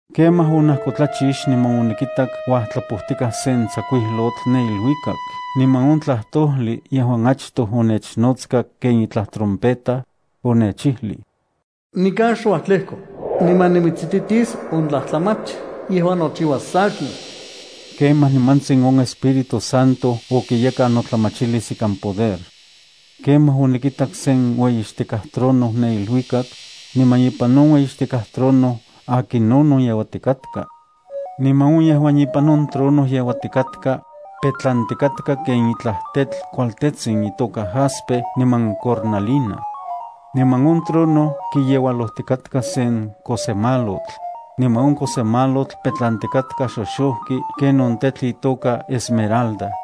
Kemaj onajkotlachix niman onikitak uajtlapojtikaj sen tsakuijlotl ne iluikak. Niman on tlajtojli yejuan achtoj onechnotska ken itlaj trompeta, onechijlij: “Nikan xuajtlejko, niman nimitsititis on tlajtlamach yejuan nochiuas sankin.” Kemaj nimantsin on Espíritu Santo okiyekan notlamachilis ikan poder. Kemaj onikitak sen ueyixtikaj trono ne iluikak, niman ipan on ueyixtikaj trono akinonon yeuatikatka. Niman on yejuan ipan on trono yeuatikatka, petlantikatka ken itlaj tetl kualtetsin itoka jaspe niman cornalina. Niman on trono kiyeualojtikatka sen kosemalotl, niman on kosemalotl petlantikatka xoxojki ken on tetl itoka esmeralda.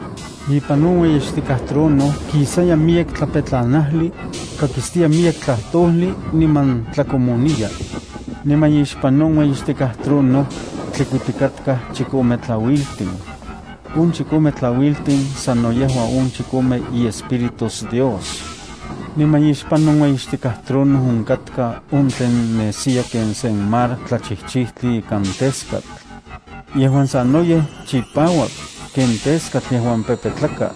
Ipan on ueyixtikaj trono kisaya miyek tlapetlanajli, kakistiya miyek tlajtojli niman tlakomoniya. Niman ixpan on ueyixtikaj trono, tlikuitikatkaj chikome tlauiltin. On chikome tlauiltin sano yejua on chikome iEspíritus Dios. Niman ixpan on ueyixtikaj trono onkatka on tlen nesiya ken sen mar tlachijchijtli ikan teskatl. Yejuan sanoyej chipauak ken teskatl yejuan pepetlaka.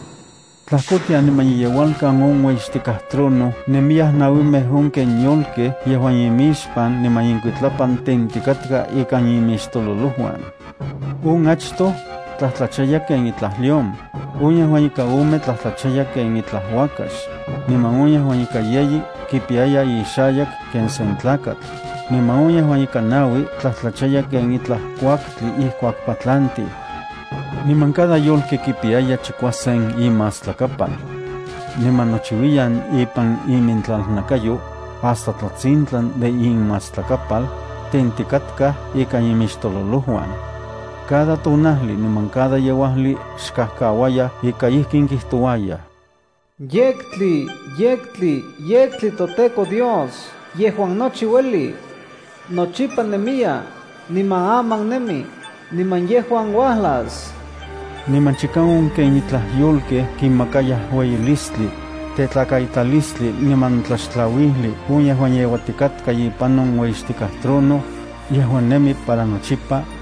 Tlajkotian niman iyeualkan on ueyixtikaj trono nemiyaj nauimej on ken yolkej yejuan imixpan niman inkuitlapan tentikatka ikan imixtololojuan. On achtoj tlajtlachaya ken itlaj león, on yejuan ika ome tlajtlachaya ken itlaj uakax, niman on yejuan ika yeyi kipiyaya ixayak ken sen tlakatl, niman on yejuan ika naui tlajtlachaya ken itlaj kuaktli ijkuak patlantiu. Niman cada yolki kipiyaya chikuasen imastlakapal. Niman nochiuiyan ipan imintlalnakayo, hasta tlatsintlan de inmastlakapal, tentikatkaj ikan inmixtololojuan. Cada tonajli niman cada yeuajli xkajkauayaj ika ijkin kijtouayaj: ¡Yektli, yektli, yektli, toTEKO Dios yejuan nochi ueli. Nochipa nemiya, niman aman nemi, niman yejuan uajlas! Niman chika on ken itlaj yolkej kimakayaj ueyilistli, tetlakaitalistli niman tlaxtlauijli on yejuan yeuatikatka ipan on ueyixtikaj trono, yejuan nemi para nochipa,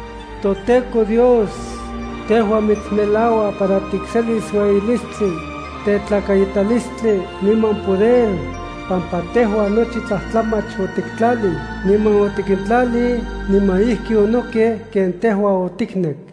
ToTEKO Dios, tejua mitsmelaua para tikselis ueyilistli, tetlakaitalistli, niman poder, pampa tejua nochi tlajtlamach otiktlalij, niman otikintlalij, niman ijki onokej ken tejua otiknek.